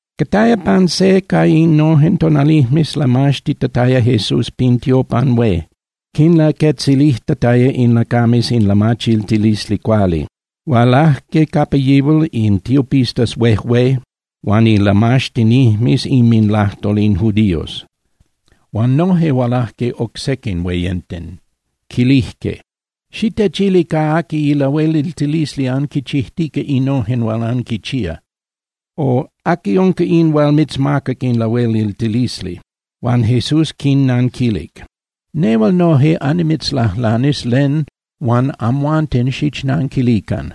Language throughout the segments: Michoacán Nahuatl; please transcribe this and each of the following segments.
Cataya pan se ca innojen tonalijmes lamaxtitataya Jesús pin tiopan hué, quinlaquetzilijtataya in lacames in lamachiltilisli cuali. Hualajque capa yihual in tiopistas huejué huan ilamaxtinijmes inminlajtol in judíos, huan noje hualajque oc sequin hueyenten. Quilijque: —Xitechili ca aqui ilahueliltilisli anquichijtica innojen hual anquinchía. O ¿aqui unca in hual mitzmacac in lahueliltilisli? Huan Jesús quinnanquilic: —Nehual noje annimitzlajlanis len huan amhuanten xichnanquilican.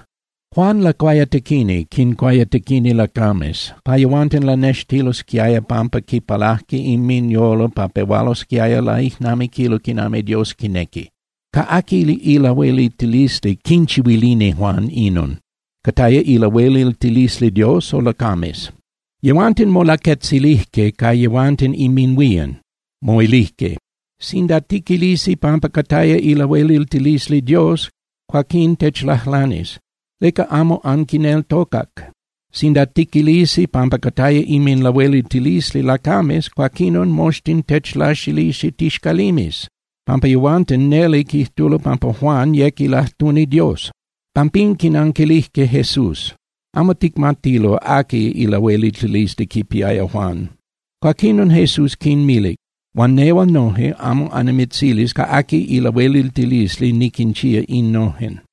Juan Lacuayatequini quincuayatequini lacames pa yehuanten lanextilosquiaya pampa quipalaje inminyolo pa pehualosquiaya laijnamiquilo quinami Dios quinequi. ¿Ca aqui ilahueliltilisli quinchihuilini Juan inon? ¿Cataya ilahueliltilisli Dios o lacames? Yehuanten molaquetzilijque ca yehuanten inminhuían, moilijque: —Sinda tiquilisi pampa cataya ilahueliltilisli Dios, cuaquinon techlajlanis: “¿Leca amo anquineltocac?” Sinda tiquilisi pampa cataya inminlahueliltilisli lacames, cuaquinon moxtin techlaxilisi tixcalimes, pampa yehuanten neli quijtulo pampa Juan yec ilajtuni Dios. Pampín quinanquilijque Jesús: —Amo ticmatilo aqui ilahueliltilisli quipiaya Juan. Cuaquinon Jesús quinmilic: —Huan nehual noje amo annimitzilis ca aqui ilahueliltilisli niquinchía innojen.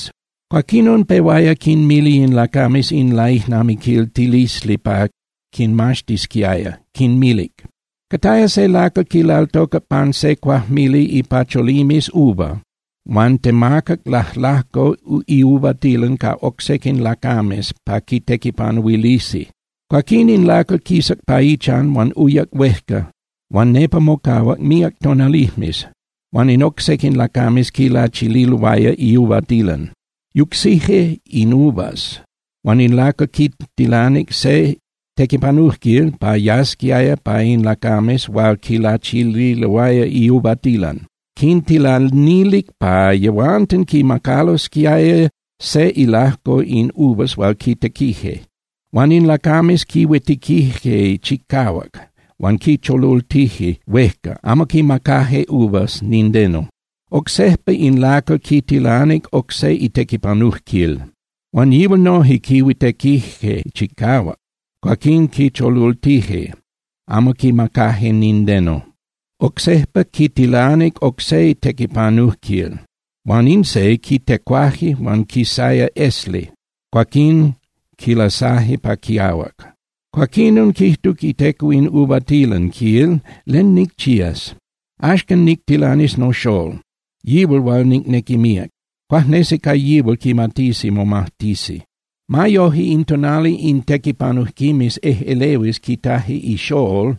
Cuaquinon pehuaya quinmili in lacames in laijnamiquiltilisli pa quinmaxtisquiaya, quinmilic: —Cataya se lacal quilaltocac pan se cuajmili ipacholimes uva huan temacac lajlajco iuvatilan ca oc sequin lacames pa quitequipanuilisi. Cuaquín in lacal quisac pa ichan huan uyac huejca huan nepa mocahuac míac tonalijmes, huan in oc sequin lacames quilachililoaya iuvatilan. Yucsije in uvas, huan in lacal quitilanic se tequipanujquil pa yasquiaya pa in lacames hual quilachililoaya iuvatilan. Quintilanilic pa yehuanten quimacalosquiaya se ilajco in uvas hual quitequije. Huan in lacames quihuitequije chicahuac, huan quicholultije huejca, amo quimacaje uvas nindeno. Oc sejpa in lacal quitilanic oc se itequipanujquil. Huan yihual noje quihuitequije chicahuac huan quihuejuecaltije, cuaquín quicholultije, amo quimacaje nindeno. Oc sejpa quitilanic oc se tequipanujquil, huan in se quitecuaje huan quisaya esli, cuaquín quilasaje pa quiahuac. Cuaquinon quijtuc iteco in uvatilan, quil: “¿Len nicchías? Axcan nictilanis noxól, yihual hual nicnequi míac. Cuajnesi ca yihual quimatisi momajtisi.” Ma yoje, in tonali in tequipanujquimes ejꞌelehuis quitaje ixól,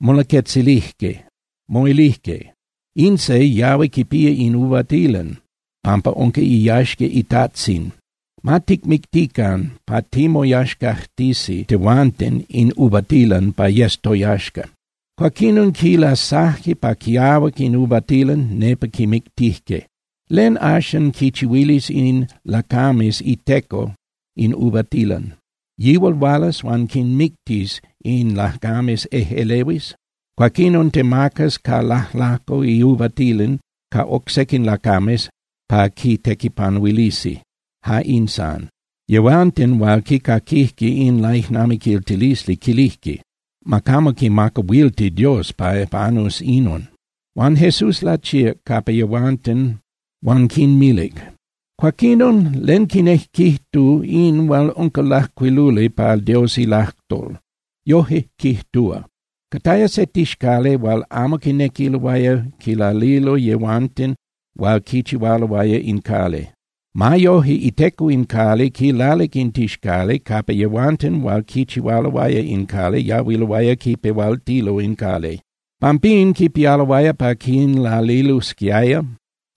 molaquetzilije, moilije: “In se yahui quipía in uvatilan pampa unca iyaxca itajtzin. Ma ticmictican pa timoyaxcajtisi tehuanten in uvatilan pa yes toyaxca.” Cuaquinon quilasaje pa quiahuac in uvatilan, nepa quimictije. ¿Len, axan, quinchihuilis in lacames iteco in uvatilan? Yihual hualas huan quinmictis in lacames ejꞌelehuis. Cuaquinon temacas ca lajlajco iuvatilan ca oc sequin lacames pa quitequipanuilisi. Ja in san. Yehuanten hual quicaquijque in laijnamiquiltilisli quilijque: —Ma camo quimacahuilti Dios pa panus inon. Huan Jesús lachíac capa yehuanten huan quinmilic: —Cuaquinon, ¿len quinejquijtu in hual unca lajcuiluli pa Dios ilajtol? Yoje quijtúa: Cataya se tixcali hual amo quinequiloaya quilalilo yehuanten hual quichihualoaya in cali. Ma yoje iteco in cali quilalic in tixcali capa yehuanten hual quichihualoaya in cali yahuiloaya quipehualtilo in cali. Pampín quipialoaya pa quinlalilosquiaya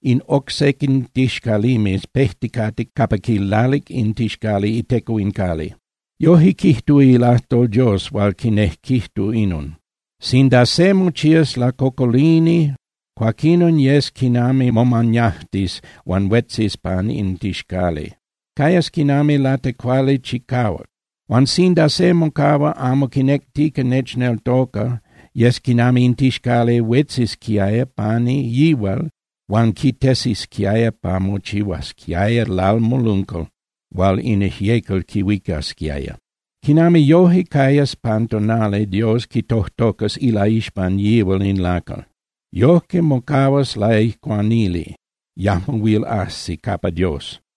in oc sequin tixcalimes pejticate capa quilalic in tixcali iteco in cali. Yoje quijtúa ilajtol Dios huan quinejquijtu inon: Sinda se mochías nolacocolini cuaquinon yes quinami momañajtis huan huetzis pan in tixcali. Cayas quinami latecuali chicahuac. Huan sinda se mocahua amo quinectica nechneltoca, yes quinami in tixcali huetzisquiaya pani yihual huan quitesisquiaya pa mochihuasquiaya lalmoluncal hual in ijyecal quihuicasquiaya. Quinami yoje cayas pan tonali Dios quitojtocas ilaixpan yihual se lacal. Yoje mocahuas laijcuanili, yajmo huil ajsi capa Dios.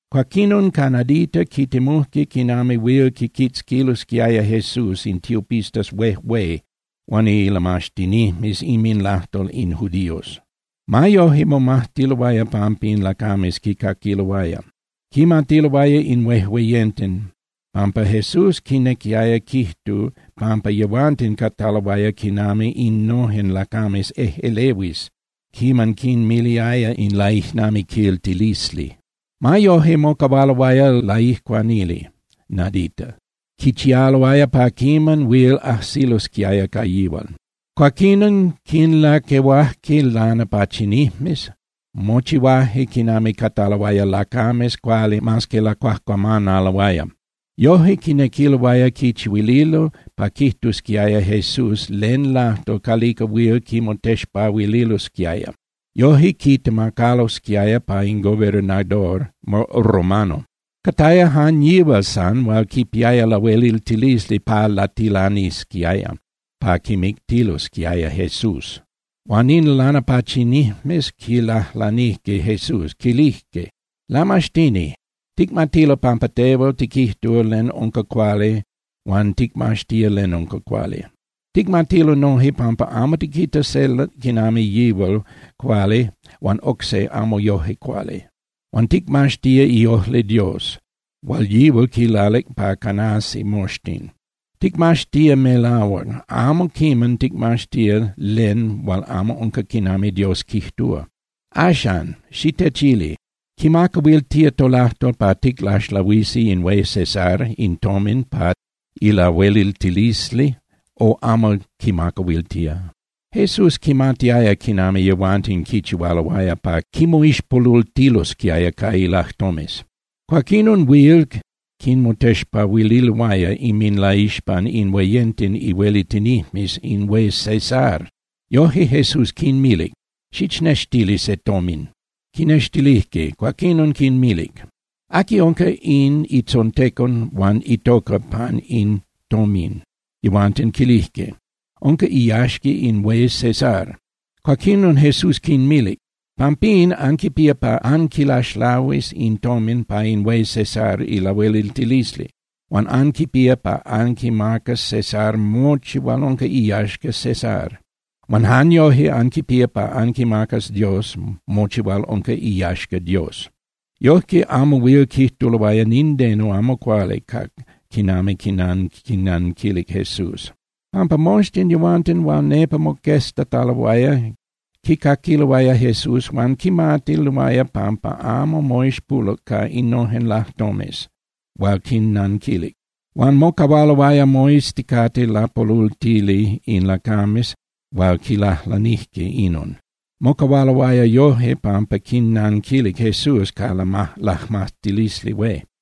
Cuaquinon ca nadita quitemujque quinami huil quiquitzquilosquiaya Jesús in tiopistas huejué huan ilamaxtinijmes inminlajtol in judíos. Ma yoje momajtiloaya pampa in lacames quicaquiloaya. Quimatiloaya in huejueyenten pampa Jesús quinequiaya quijtu pampa yehuanten cataloaya quinami innojen lacames ejꞌelehuis quiman quinmiliaya in laijnamiquiltilisli. Ma yoje, mocahualoaya laijcuanili nadita, quichialoaya pa quiman huil ajsilosquiaya ca yihual. Cuaquinon quinlaquehuajque lanapachinijmes, mochihuaje quinami cataloaya lacames cuali mas que lacuajcuamanaloaya. Yoje quinequiloaya quichihuililo pa quijtusquiaya Jesús len lajtol calica huil quimotexpahuililosquiaya. Yoje quitemacalosquiaya pa in gobernador romano. Cataya jan yihual san hual quipiaya lahueliltilisli pa latilanisquiaya pa quimictilsquiaya Jesús. Huan in lanapachinijmes quilajlanijque Jesús, quilijque: —Lamaxtini, ticmatilo pampa tehual tiquijtúa len unca cuali huan ticmaxtía len unca cuali. Ticmatilo noje pampa amo tiquita se quinami yihual cuali huan oc se amo yoje cuali. Huan ticmaxtía iojli Dios hual yihual quilalic pa canasi moxtin. Ticmaxtía melahuac, amo quiman ticmaxtía len hual amo unca quinami Dios quijtúa. Axan, xitechili, ¿quimacahuiltía tolajtol pa ticlaxlahuisi in hué César in tomin pa ilahueliltilisli, o amo quimacahuiltía? Jesús quimatiaya quinami yehuanten quichihualoaya pa quimoixpolultilosquiaya ca ilajtomes. Cuaquinon huil quimotexpahuililoaya inminlaixpan in hueyenten ihuelitinijmes in hué César. Yoje Jesús quinmilic: —Xichnextili se tomin. Quinextilijque. Cuaquinon quinmilic: —¿Aqui unca in itzontecon huan itoca pan in tomin? Yehuanten quilijque: —Unca iyaxca in hué César. Cuaquinon Jesús quinmilic: —Pampín, anquipía pa anquilaxlahuis in tomin pa in hué César ilahueliltilisli, huan anquipía pa anquimacas César mochi hual unca iyaxca César. Huan jan yoje anquipía pa anquimacas Dios mochi hual unca iyaxca Dios. Yojque amo huil quijtuloaya nindeno amo cuali ca quinami quinnanquilic Jesús, pampa moxtin yehuanten hual nepa moqueztataloaya quicaquiloaya Jesús huan quimatiloaya pampa amo moixpoluc ca innojen lajtomes hual quinnanquilic. Huan mocahualoaya moizticate lapolultili in lacames hual quilajlanijque inon. Mocahualoaya yoje pampa quinnanquilic Jesús ca ilajmatilisli hué.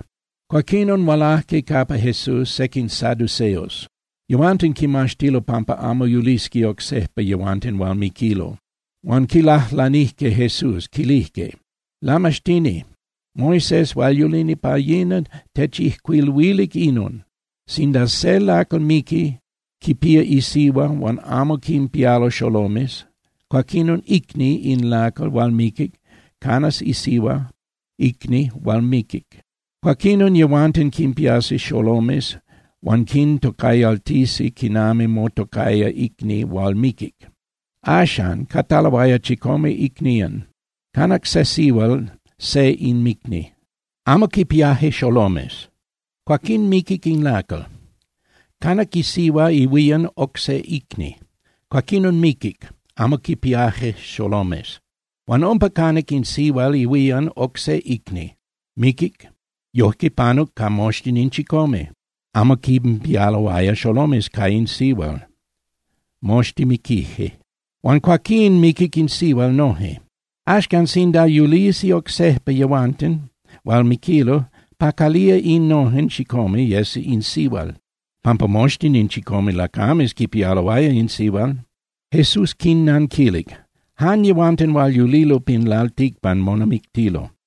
Cuaquinon hualajque capa Jesús sequin saduceos, yehuanten quimaxtilo pampa amo yulisqui oc sejpa yehuanten hual miquilo. Huan quilajlanijque Jesús, quilijque: —Lamaxtini, Moisés hual yulini pa yina techijcuiluilic inon: Sinda se lacal miqui, quipía isihua huan amo quinpialo xolomes, cuaquinon icni in lacal hual miquic canas isihua icni hual miquic. Cuaquinon yehuanten quinpiasi xolomes huan quintocayaltisi quinami motocaya icni hual miquic. Axan, cataloaya chicome icnían. Canac se sihual se inmicni, amo quinpiaje xolomes, cuaquín miquic in lacal. Canac isihua ihuían oc se icni, cuaquinon miquic, amo quinpiaje xolomes. Huan umpa canac in sihual ihuían oc se icni, miquic. Yojque panuc ca moxtin in chicome, amo quinpialoaya xolomes ca in sihual, moxtin miquije. Huan cuaquín miquic in sihual noje. Axcan, sinda yulisi oc sejpa yehuanten hual miquilo, ¿pa calía innojen chicome yes in sihual? Pampa moxtin in chicome lacames quipialoaya in sihual. Jesús quinnanquilic: —Jan yehuanten hual yulilo pin lalticpan monamictilo.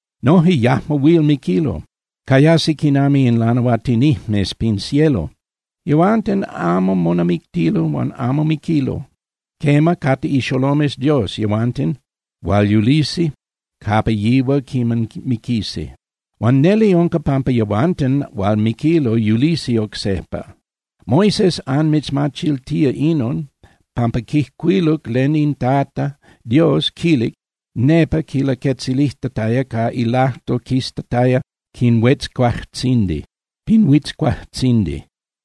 Noje yajmo huil miquilo, cayasi quinami in lanahuatinijmes pin cielo. Yehuanten amo monamictilo huan amo miquilo. Quema, cate ixolomes Dios yehuanten hual yulisi capa yihual quiman miquisi. Huan neli unca pampa yehuanten hual miquilo yulisi oc sejpa. Moisés anmitzmachiltía inon, pampa quijcuiluc len in Tata Dios quilic nepa quilaquetzilijtataya ca ilajtol quistataya pin huitzcuajtzindi.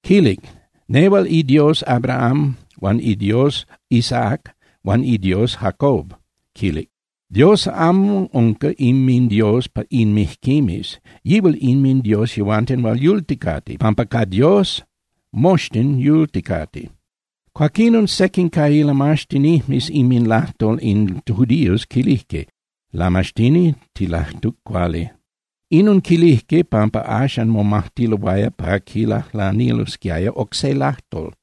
Quilic: “Nehual iDios Abraham huan iDios Isaac huan iDios Jacob”, quilic. Dios amo unca inminDios in mijquimes, yihual inminDios yehuanten hual yulticate, pampa Dios quinmita moxtin quinami yulticate. Cuaquinon sequin ca ilamaxtinijmes inminlajtol in judíos quilijque: —Lamaxtini, tilajtuc cuali. Inon quilijque pampa axan momajtiloaya pa quilajlanilosquiaya oc se lajtol.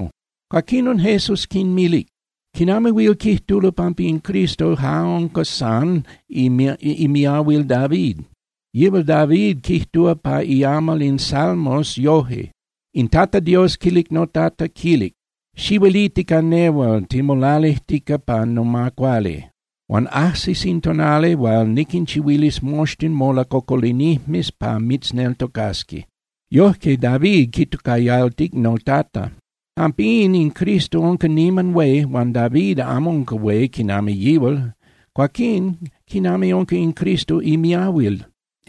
Cuaquinon Jesús quinmilic: —¿Quinami huil quijtulo pampa in Cristo ja unca san imiahuil David? Yihual David quijtúa pa iamal in Salmos yoje: In Tata Dios quilic noTata, quilic: “Xihueliti ca nehual timolalijtica pa noma cuali. Huan ajsis in tonali hual niquinchihuilis moxtin molacocolinijmes pa mitzneltocasqui.” Yoje, David quitocayaltic “noTata.” Pampín, in Cristo unca niman hué huan David amo unca hué quinami yihual. Cuaquín, ¿quinami unca in Cristo imiahuil?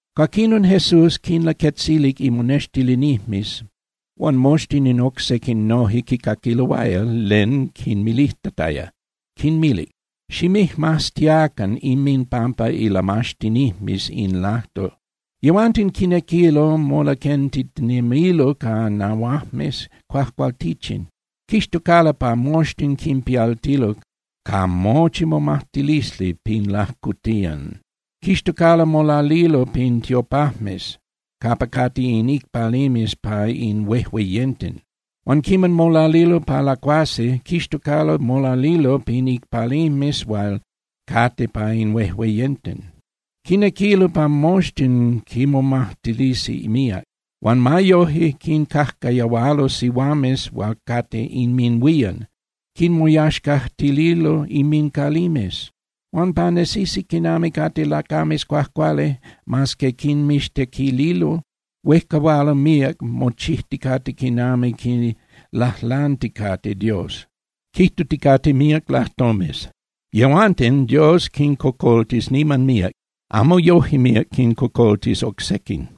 Cuaquinon Jesús quinlaquetzilic imonextilinijmes huan moxtin in oc sequin noje quicaquiloaya len quinmilijtataya, quinmilic: —Ximijmaztiacan inminpampa ilamaxtinijmes in lajtol. Yehuanten quinequilo molaquentitinemilo ca nahuajmes cuajcualtichin. Quixtocalo pa moxtin quinpialtilo ca mochi momajtilisli pin lajcotiyan. Quixtocalo molalilo pin tiopajmes capa cate in icpalimes pa in huejueyenten. Huan quiman molalilo pa lacuasi, quixtocalo molalilo pan icpalimes hual cate pa in huejueyenten. Quinequilo pa moxtin quinmomajtilisi míac, huan ma yoje, quincajcayahualo sihuames hual cate inminhuían, quinmoyaxcajtililo inmincalimes. Huan pa nesisi quinami cate lacames cuajcuali, mas que quinmixtequililo, huejcahualo míac mochijticate quinami quilajlanticate Dios, quijtuticate míac lajtomes. Yehuanten Dios quincocoltis niman míac, amo yoje míac quincocoltis oc sequin.